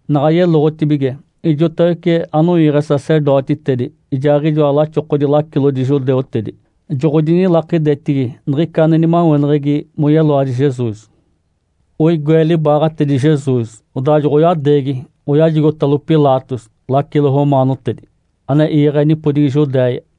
Naɡ̶a yeloɡ̶otibige, ijotawece anoiiɡ̶e sacerdotitedi, ijaaɡ̶ijoa laxokodi lacilodi judeutedi joɡ̶odinilakidetigi niɡ̶ica ane nimaweneɡ̶egi moyeloadi Jesus. Oigoe libaaɡ̶atedi Jesus, odaa joɡ̶oyadeegi, oyajigotalo Pilatos, lacilo romaanotedi ane iiɡ̶e nipodigi Judéia.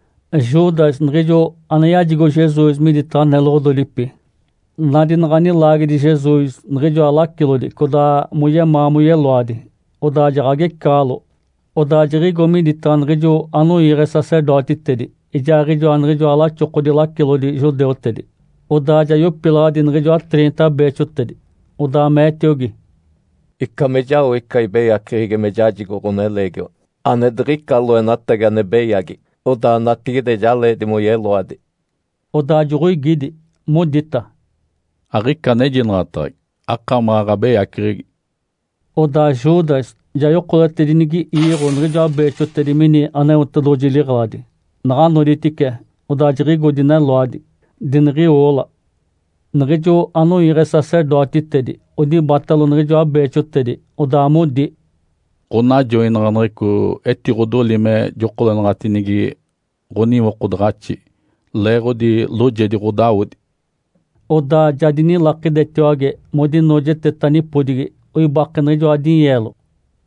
Judas, niɡ̶ijo ane yajigo Jesus miditaɡ̶a neloɡ̶ododipi, nadi naɡ̶a nilaagedi Jesus niɡ̶ijoa lacilodi codaa moyemaa moyeloadi, odaa jaɡ̶agecaɡ̶alo, odaa jiɡ̶igo miditaɡ̶a niɡ̶ijo anoiiɡ̶e sacerdotitedi ijaaɡ̶ijoa niɡ̶ijoa laxokodi lacilodi judeutedi, odaa ja yopilaɡ̶adi niɡ̶ijoa triinta beexotedi. Odaa meetiogi, “Ica me jao ica ibeyaceɡ̶egi me jajigo ɡ̶oneleegiwa ane diɡ̶ica loenatagi ane beyagi odaa natigide ja leedi moyeloadi.” Odaa joɡ̶oigidi, modita, “Aɡ̶ica anejinaɡ̶ataɡ̶agi. Akamaɡ̶a ɡ̶abeyaceɡ̶egi.” Odaa Judas ja yokoletedinigi iiɡ̶o niɡ̶ijoa beexotedi mini Aneotedoɡ̶oji liɡ̶eladi. Naɡ̶a noditice, odaa jiɡ̶igo dineloadi, diniɡ̶iwoola. Niɡ̶ijo anoiiɡ̶e sacerdotitedi odibatalo niɡ̶ijoa beexotedi, odaa modi, “Ǥonajoinaɡ̶aneɡ̶eco etiɡ̶odoli me jokolenaɡ̶atinigi ɡ̶oniwokodaɡ̶axi, leeɡ̶odi loojedi ɡ̶odawodi.” Odaa ja dinilakidetiwage modinoojeteta nipodigi, oibake niɡ̶ijoa dinyeelo.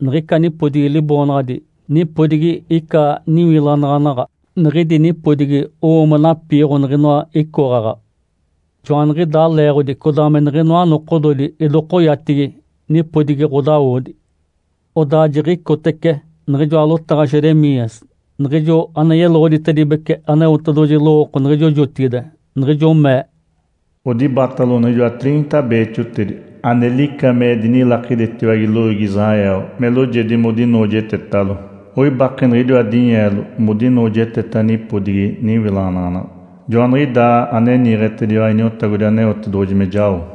Niɡ̶ica nipodigi liboonaɡ̶adi “Nipodigi ica niwilanaɡ̶anaɡ̶a”. Niɡ̶idi nipodigi owo me napiiɡ̶o niɡ̶inoa icoɡ̶aɡ̶a. Joaniɡ̶idaa leeɡ̶odi codaa me niɡ̶inoa nokododi idokoyatigi, “Nipodigi ɡ̶odawodi”. Odaa jiɡ̶icotece niɡ̶ijoa lotaɡ̶a Jeremias, niɡ̶ijo ane yeloɡ̶oditedibece Aneotedoɡ̶oji lowooko niɡ̶ijo jotigide, niɡ̶ijo mee, “Odibatalo niɡ̶ijoa triinta beexotedi, ane lica me dinilakidetiwage loiigi Israel me loojedi modinoojetetalo. Oibake niɡ̶idiwa dinyeelo modinoojeteta nipodigi niwilanaɡ̶anaɡ̶a. Joaniɡ̶idaa ane niiɡ̶etediwa Iniotagodi Aneotedoɡ̶oji me jao.”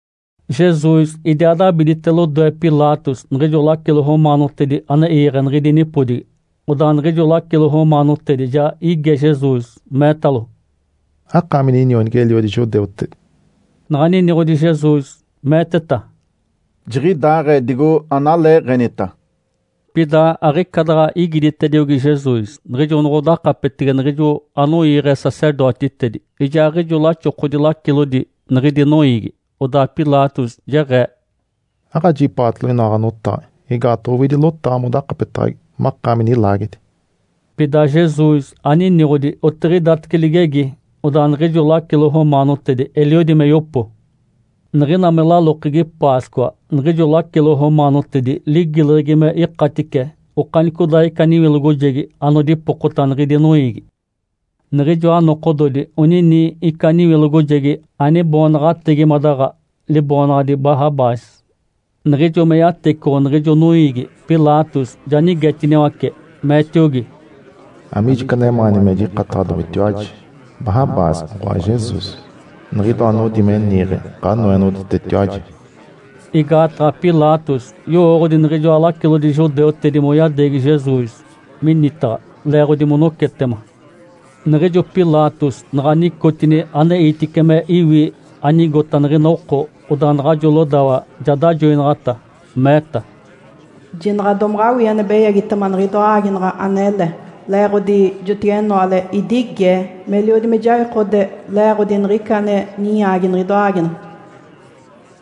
Jesus idiaa dabidite lodoe Pilatos, niɡ̶ijo lacilo romaanotedi ane iiɡ̶e niɡ̶idi nipodigi. Odaa niɡ̶ijo lacilo romaanotedi ja ige Jesus, meetalo, “Akaami ninionigi-eliodi judeutedi?” Naɡ̶a niniɡ̶odi Jesus, meeteta, “Jiɡ̶idaaɡ̶ee digo analeeɡ̶enita.” Pida aɡ̶ica daɡ̶a igiditediogi Jesus, niɡ̶ijo noɡ̶odakapetege niɡ̶ijo anoiiɡ̶e sacerdotitedi ijaaɡ̶ijoa laxokodi lacilodi niɡ̶idi noiigi, Odaa Pilatos jeɡ̶ee, “Aɡ̶ajipaatalo inoa ɡ̶anotaɡ̶a? Igaataɡ̶a owidi lotaɡ̶a modakapetaɡ̶agi makaami nilaagedi.” Pida Jesus aniniɡ̶odi, otiɡ̶idatece ligegi, odaa niɡ̶ijo lacilo romaanotedi eliodi me yopo. Niɡ̶ina me lalokegi Páscoa, niɡ̶ijo lacilo romaanotedi ligileɡ̶egi me ikatice okanicodaaɡ̶ica niwilogojegi anodipokota niɡ̶idi noiigi. Niɡ̶ijoa nokododi onini ica niwilogojegi aniboonaɡ̶ategimadaɡ̶a, liboonaɡ̶adi Barrabás. Niɡ̶ijo me yatecoɡ̶o niɡ̶ijo noiigi, Pilatos ja nigetiniwace, meetiogi, “Amiijo ica anemaani me jikataɡ̶adomitiwaji, Barrabás oɡ̶oa Jesus, niɡ̶idoa anodi me niiɡ̶e Ǥanoenoɡ̶oditetiwaji?” Igaataɡ̶a Pilatos yowooɡ̶odi niɡ̶ijoa lacilodi judeutedi moyadeegi Jesus minitaɡ̶a leeɡ̶odi monocetema. Niɡ̶ijo Pilatos naɡ̶a nicotini aneitice me iwi anigota niɡ̶ina oko, odaa naɡ̶ajo lodawa ja dajoinaɡ̶ata, meeta, “Jinaɡ̶a domaɡ̶awii ane beyagitema niɡ̶idoa aaginaɡ̶a anele. Le-eeɡ̶odi jotigenoale idigee, meliodi me jawikode le-eeɡ̶odi niɡ̶ica ane ninyaagi niɡ̶idoa aaginaɡ̶a.”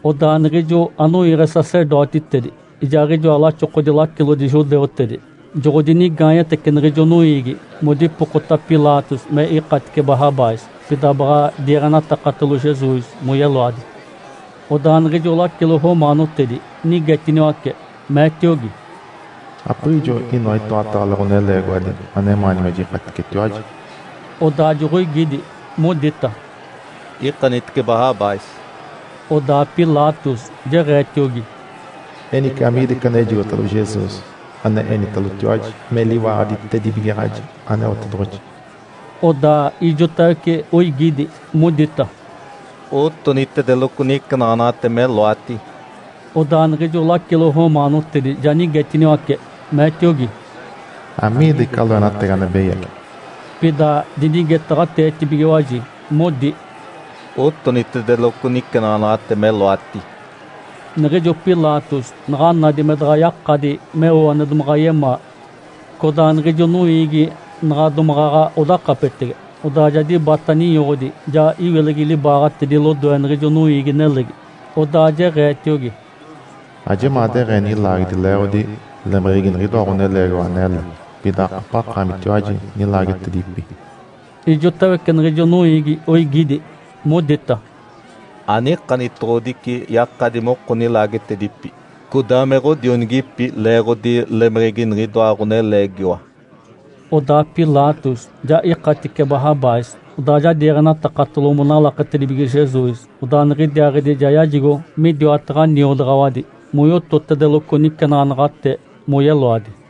Odaa niɡ̶ijo anoiiɡ̶e sacerdotitedi ijaaɡ̶ijoa laxokodi lacilodi judeutedi joɡ̶odinigaanyetece niɡ̶ijo noiigi modipokota Pilatos me ikatice Barrabás, pida baɡ̶a diiɡ̶enatakatalo Jesus moyeloadi. Odaa niɡ̶ijo lacilo romaanotedi nigetiniwace, meetiogi, “Apiɡ̶ijo inoa itoataale ɡ̶oneleegiwadi anemaani me jikaticetiwaji?” Odaa joɡ̶oigidi, modita, “Ikanitice Barrabás!” Odaa Pilatos jeɡ̶eetiogi, “Enice, amiida ica anejigotalo Jesus, ane enitalotiwaji me liwaaɡ̶aditedibigaɡ̶aji Aneotedoɡ̶oji?” Odaa ijotawece oigidi, modita, “Otonitedeloco nicenaɡ̶anaɡ̶ate meloati!” Odaa niɡ̶ijo lacilo romaanotedi ja nigetiniwace, meetiogi, “Amiida ica loenatagi ane beyagi?” Pida dinigetaɡ̶ateetibigiwaji, modi, “Otonitedeloco nicenaɡ̶anaɡ̶ate meloati!” Niɡ̶ijo Pilatos naɡ̶a nadi me daɡ̶a yakadi meo ane domaɡ̶a yemaa, codaa niɡ̶ijo noiigi naɡ̶a domaɡ̶aɡ̶a odakapetege, odaa ja dibata ninyoɡ̶odi, ja iwilegi libaaɡ̶atedi lodoe niɡ̶ijo noiigi-nelegi. Odaa jeɡ̶eetiogi, “Ajemaa deɡ̶ee nilaagedi leeɡ̶odi lemeɡ̶egi niɡ̶idoa ɡ̶oneleegiwa anele. Pida akapaɡ̶akaamitiwaji nilaagetedipi.” Ijotawece niɡ̶ijo noiigi oigidi, modita, “Anikanitoɡ̶odici yakadi moko nilaagetedipi, codaa me ɡ̶odionigipi leeɡ̶odi lemeɡ̶egi niɡ̶idoa ɡ̶oneleegiwa.” Odaa Pilatos ja ikatice Barrabás. Odaa ja diiɡ̶enatakatalo monalaketedibige Jesus, odaa niɡ̶idiaaɡ̶idi ja yajigo midiwataɡ̶a niodaɡ̶awadi moyototedeloco nicenaɡ̶anaɡ̶ate moyeloadi.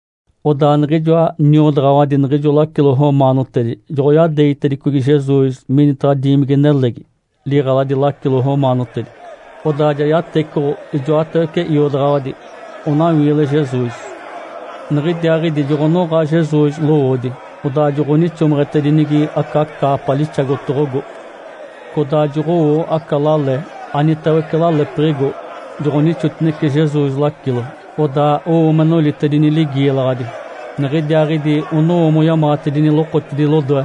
Odaa niɡ̶ijoa niodaɡ̶awadi niɡ̶ijo lacilo romaanotedi joɡ̶oyadeegitedicogi Jesus minitaɡ̶a diimigi-nelegi, liɡ̶eladi lacilo romaanotedi. Odaa ja yatecoɡ̶o ijoatawece iodaɡ̶awadi onawiile Jesus. Niɡ̶idiaaɡ̶idi joɡ̶onoɡ̶a Jesus lowoodi, odaa joɡ̶onixomeɡ̶etedinigi aca caapa lixagotoɡ̶ogo. Codaa joɡ̶owo aca lale, anitawece lalepiɡ̶igo, joɡ̶onixotinece Jesus lacilo. Odaa owo me nolitedini ligiilaɡ̶adi. Niɡ̶idiaaɡ̶idi onowo moyamaɡ̶atedini lokotidi lodoe,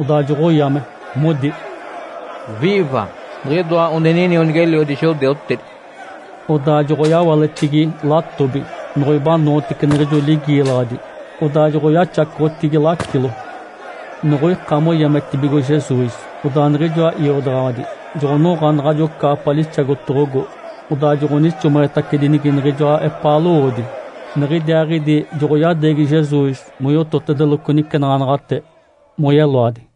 odaa joɡ̶oyame, modi, “Viiva, Niɡ̶idoa one ninionigi-eliodi judeutedi!” Odaa joɡ̶oyawaletigi latobi, noɡ̶oibanootece niɡ̶ijo ligiilaɡ̶adi, odaa joɡ̶oyaxacoɡ̶otigi lacilo. Noɡ̶oika moyametibigo Jesus, odaa niɡ̶ijoa iodaɡ̶awadi joɡ̶onoɡ̶a naɡ̶ajo caapa lixagotoɡ̶ogo, odaa joɡ̶onixomeɡ̶etacedinigi niɡ̶ijoa epaa lowoodi. Niɡ̶idiaaɡ̶idi joɡ̶oyadeegi Jesus moyototedeloco nicenaɡ̶anaɡ̶ate moyeloadi.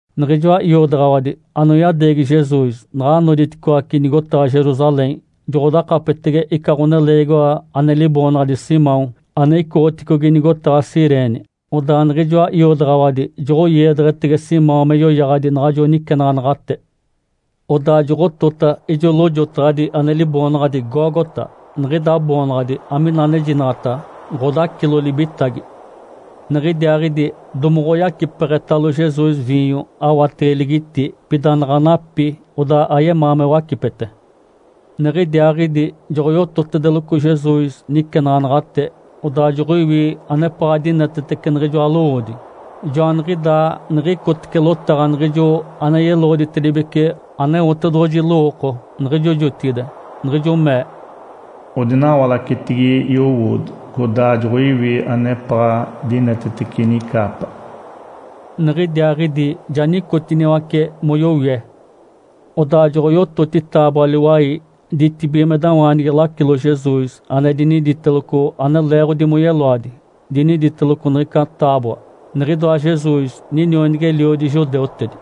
Niɡ̶ijoa iodaɡ̶awadi anoyadeegi Jesus naɡ̶a noditicoaci nigotaɡ̶a Jerusalém, joɡ̶odakapetege ica ɡ̶oneleegiwa ane liboonaɡ̶adi Simão, ane icoɡ̶oticogi nigotaɡ̶a Cirene. Odaa niɡ̶ijoa iodaɡ̶awadi joɡ̶oiedeɡ̶etege Simão me yoyaɡ̶adi naɡ̶ajo nicenaɡ̶anaɡ̶ate. Odaa joɡ̶otota ijo lojotaɡ̶adi ane liboonaɡ̶adi Gólgota. Niɡ̶ida boonaɡ̶adi amina anejinaɡ̶ata, “Ǥodacilo libitagi”. Niɡ̶idiaaɡ̶idi domoɡ̶oyacipeɡ̶etalo Jesus viinyo awatege ligiti. Pida naɡ̶a napi, odaa ayemaa me wacipete. Niɡ̶idiaaɡ̶idi joɡ̶oyototedeloco Jesus nicenaɡ̶anaɡ̶ate, odaa joɡ̶oiwi anepaɡ̶a dinetetece niɡ̶ijoa lowoodi. Joaniɡ̶idaa niɡ̶icotece lotaɡ̶a niɡ̶ijo ane yeloɡ̶oditedibece Aneotedoɡ̶oji lowooko niɡ̶ijo jotigide, niɡ̶ijo mee, “Odinawalacetigi yowoodi, codaa joɡ̶oiwi anepaɡ̶a dinetetece inicaapa.” Niɡ̶idiaaɡ̶idi ja nicotiniwace moyowie. Odaa joɡ̶oyototi taaboa-liwai ditibigimedawaanigi lacilo Jesus ane diniditeloco ane leeɡ̶odi moyeloadi. Diniditeloco niɡ̶ica taaboa, “NIǤIDOA JESUS, NINIONIGI-ELIODI JUDEUTEDI.”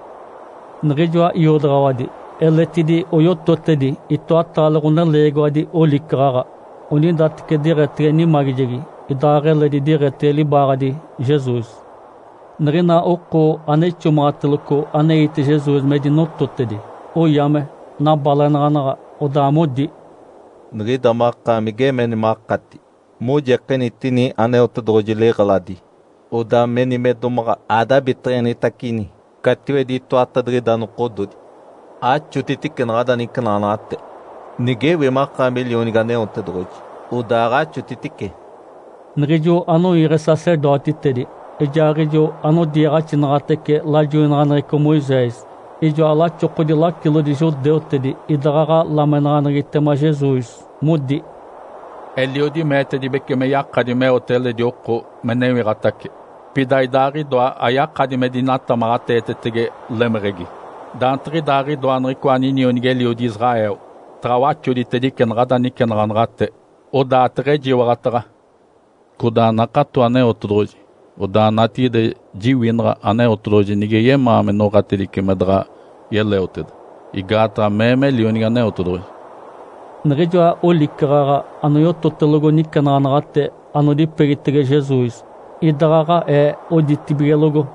Niɡ̶ijoa iodaɡ̶awadi eletidi oyototedi itoataale ɡ̶oneleegiwadi olicaɡ̶aɡ̶a, onidateci diɡ̶etege nimagijegi idaaɡ̶eledi diɡ̶etege libaaɡ̶adi Jesus. Niɡ̶ina oko ane ixomaɡ̶ateloco aneite Jesus me dinototedi, oyame. Nabalenaɡ̶anaɡ̶a, odaa modi, “Niɡ̶ida makaami geemeni makati mojikenitini Aneotedoɡ̶oji liɡ̶eladi, odaa meni me domaɡ̶a adabiteɡ̶enitacini catiwedi itoatadiɡ̶ida nokododi! Axotitice naɡ̶ada nicenaɡ̶anaɡ̶ate! Nigewi makaami Lionigi Aneotedoɡ̶oji, odaaɡ̶axotitice!” Niɡ̶ijo anoiiɡ̶e sacerdotitedi ijaaɡ̶ijo anodiiɡ̶axinaɡ̶atece lajoinaɡ̶aneɡ̶eco Moisés, ijoa laxokodi lacilodi judeutedi idaɡ̶aɡ̶a lamenaɡ̶aneɡ̶egitema Jesus, modi, “Eliodi meetedibece me yakadi meote eledi oko me newiɡ̶atace, pida Idaaɡ̶idoa ayakadi me dinatamaɡ̶ateetetege lemeɡ̶egi! Daantiɡ̶idaaɡ̶idoa niɡ̶icoa ninionigi-eliodi Israel, taɡ̶a waxoditedice naɡ̶ada licenaɡ̶anaɡ̶ate, odaa teɡ̶ejiwaɡ̶ataɡ̶a. Codaa nakato Aneotedoɡ̶oji, odaa natigide jiwinaɡ̶a Aneotedoɡ̶oji nige yemaa me noɡ̶atedice me daɡ̶a yeleoteda. Igaataɡ̶a mee me Lionigi Aneotedoɡ̶oji.” Niɡ̶ijoa olicaɡ̶aɡ̶a anoyototelogo nicenaɡ̶anaɡ̶ate anodipegitege Jesus, idaɡ̶aɡ̶aee, oditibigelogo.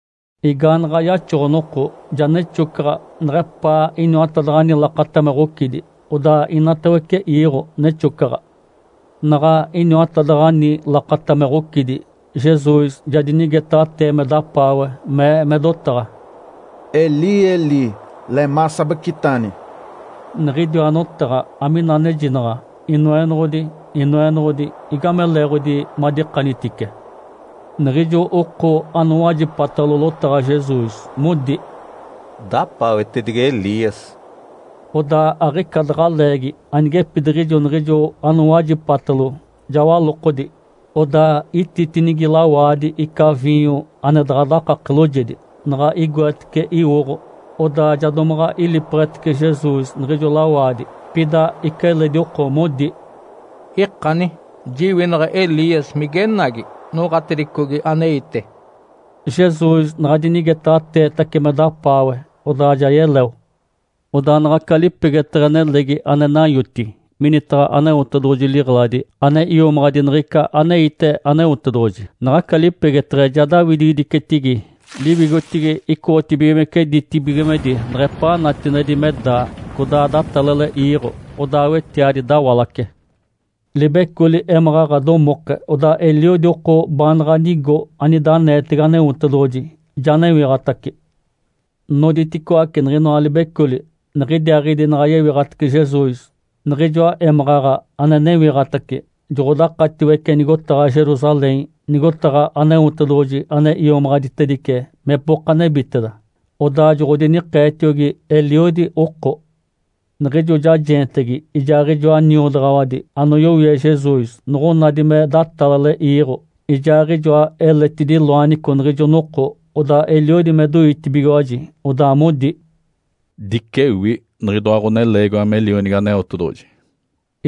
Igaanaɡ̶a yaxoɡ̶o-noko, ja nexocaɡ̶a neɡ̶epaa iniwatadaɡ̶ani lakata me ɡ̶ocidi, odaa inatawece iiɡ̶o nexocaɡ̶a. Naɡ̶a iniwatadaɡ̶ani lakata me ɡ̶ocidi, Jesus ja dinigetaɡ̶atee me dapaawe, mee me dotaɡ̶a, “Eli, Eli, lemá sabactani!” Niɡ̶idiwa notaɡ̶a amina anejinaɡ̶a, “Inoenoɡ̶odi, Inoenoɡ̶odi, igame leeɡ̶odi madikanitice?” Niɡ̶ijo oko anowajipatalo lotaɡ̶a Jesus, modi, “Dapaawetedigi Elias.” Odaa aɡ̶ica daɡ̶a leegi anigepidiɡ̶ijo niɡ̶ijo anowajipatalo ja walokodi, odaa ititinigi lawaadi ica viinyo ane daɡ̶a dakake loojedi. Naɡ̶a igoetece iwoɡ̶o, odaa ja domaɡ̶a ilipeɡ̶etece Jesus niɡ̶ijo lawaadi. Pida ica eledi oko modi, “Ikani! Jiwinaɡ̶a Elias migenagi noɡ̶atedicogi aneite.” Jesus naɡ̶a dinigetaɡ̶ateetace me dapaawe, odaa ja yeleo. Odaa naɡ̶aca lipegeteɡ̶e nelegi ane nanyoti minitaɡ̶a Aneotedoɡ̶oji liɡ̶eladi ane iomaɡ̶adi niɡ̶ica aneite Aneotedoɡ̶oji, naɡ̶aca lipegeteɡ̶e ja daawidigidicetigi liwigotigi icoɡ̶otibigimece ditibigimedi neɡ̶epaa natinedi me daa. Codaa datalale iiɡ̶o, odaa wetiadi dawalace. Libecoli émaɡ̶aɡ̶a domoke, odaa eliodi oko baanaɡ̶a nigo anida aneetege Aneotedoɡ̶oji ja newiɡ̶atace. Noditicoaci niɡ̶inoa libecoli. Niɡ̶idiaaɡ̶idi naɡ̶a yewiɡ̶atace Jesus, niɡ̶ijoa émaɡ̶aɡ̶a ane newiɡ̶atace joɡ̶odakatiwece nigotaɡ̶a Jerusalém, nigotaɡ̶a Aneotedoɡ̶oji ane iomaɡ̶aditedice mepoka nebiteda. Odaa joɡ̶odinikeetiogi eliodi oko. Niɡ̶ijo jajeentegi ijaaɡ̶ijoa niodaɡ̶awadi anoyowie Jesus noɡ̶onadi me datalale iiɡ̶o ijaaɡ̶ijoa eletidi loanico niɡ̶ijo noko, odaa eliodi me doitibigiwaji, odaa modi, “Dicewi, niɡ̶idoa ɡ̶oneleegiwa me Lionigi Aneotedoɡ̶oji!”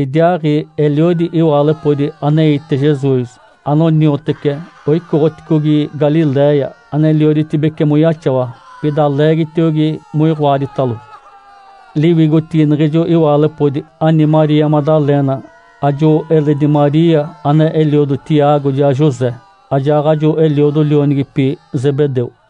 Idiaaɡ̶i eliodi iwaalepodi aneite Jesus, anoniotece, oicoɡ̶oticogi Galiléia anelioditibece moyaxawa. Pida leegitiogi moiɡ̶oaditalo. Liwigotigi niɡ̶ijo iwaalepodi ani Maria Madalena, ajo eledi Maria ane eliodo Tiago ijaa José, ajaaɡ̶ajo eliodo lionigipi Zebedeu.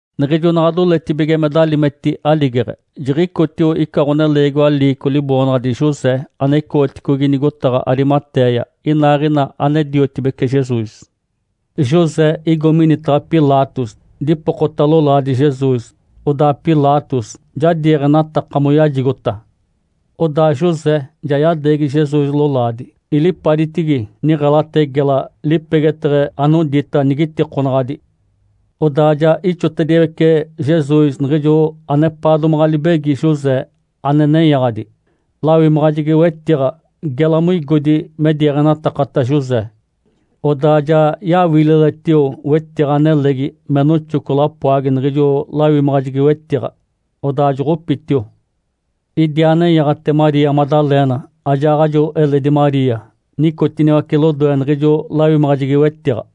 Niɡ̶ijo naɡ̶a doletibige me dalimeti aligeɡ̶e, jiɡ̶icotio ica ɡ̶oneleegiwa liico liboonaɡ̶adi José, ane icoɡ̶oticogi nigotaɡ̶a Arimatéia. Inaaɡ̶ina ane-diotibece Jesus. José igo minitaɡ̶a Pilatos, dipokota lolaadi Jesus. Odaa Pilatos ja diiɡ̶enataka moyajigota. Odaa José ja yadeegi Jesus lolaadi, ilipaditigi niɡ̶elate gela, lipegeteɡ̶e anodita nigitikonaɡ̶adi. Odaa ja ixotediwece Jesus niɡ̶ijo anepaa domaɡ̶a libegi José ane nenyaɡ̶adi, lawimaɡ̶ajegi-wetiɡ̶a, gela moigodi me diiɡ̶enatakata José. Odaa ja yawililetio wetiɡ̶a nelegi me noxoco lapoagi niɡ̶ijo lawimaɡ̶ajegi-wetiɡ̶a. Odaa joɡ̶opitio. Idiaa nenyaɡ̶ate Maria Madalena ajaaɡ̶ajo eledi Maria. Nicotiniwace lodoe niɡ̶ijo lawimaɡ̶ajegi-wetiɡ̶a.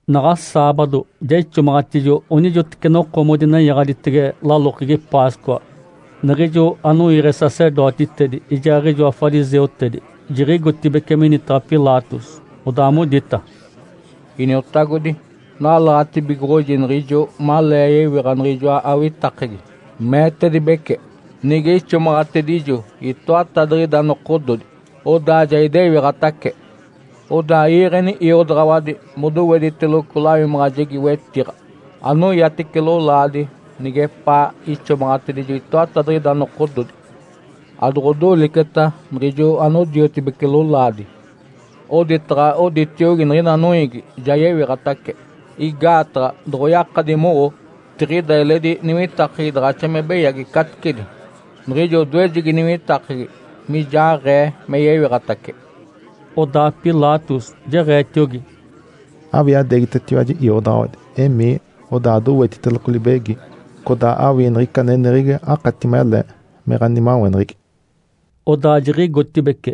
Naɡ̶a saabado, ja ixomaɡ̶atijo onijoteci noko modinenyaɡ̶aditege lalokegi Páscoa. Niɡ̶ijo anoiiɡ̶e sacerdotitedi ijaaɡ̶ijoa fariseutedi jiɡ̶igotibeci minitaɡ̶a Pilatos. Odaa modita, “Iniotagodi, nalaɡ̶atibigoɡ̶oji niɡ̶ijo malee yewiɡ̶a niɡ̶ijoa awitakegi, meetedibece, ‘Nige ixomaɡ̶atedijo itoatadiɡ̶ida nokododi, odaa ja idewiɡ̶atace.’ Odaa iiɡ̶eni iodaɡ̶awadi modowediteloco lawimaɡ̶ajegi-wetiɡ̶a anoyatice lolaadi nigepaa ixomaɡ̶atedijo itoatadiɡ̶ida nokododi, adoɡ̶odoliceta niɡ̶ijo anodiotibece lolaadi, oditaɡ̶a oditiogi niɡ̶ina noiigi, ‘Ja yewiɡ̶atace!’ Igaataɡ̶a doɡ̶oyakadi mowo, tiɡ̶ida eledi niwitakegi daɡ̶axa me beyagi caticedi niɡ̶ijo odoejegi niwitakegi mijaaɡ̶ee me yewiɡ̶atace.” Odaa Pilatos jeɡ̶eetiogi, “Awii adeegitetiwaji iodaɡ̶awadi. Emii, odaa adowetiteloco libegi, codaa awii niɡ̶ica aneneɡ̶egi akati mele me ɡ̶animaweneɡ̶egi.” Odaa jiɡ̶igotibeci,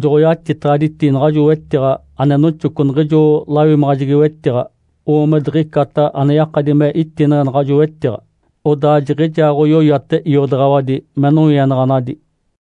joɡ̶oyatitaɡ̶aditi naɡ̶ajo wetiɡ̶a ane noxoco niɡ̶ijo lawimaɡ̶ajegi-wetiɡ̶a, owo me diɡ̶icata ane yakadi me itineɡ̶e naɡ̶ajo wetiɡ̶a. Odaa jiɡ̶idiaaɡ̶oyoyate iodaɡ̶awadi me nowienaɡ̶anadi.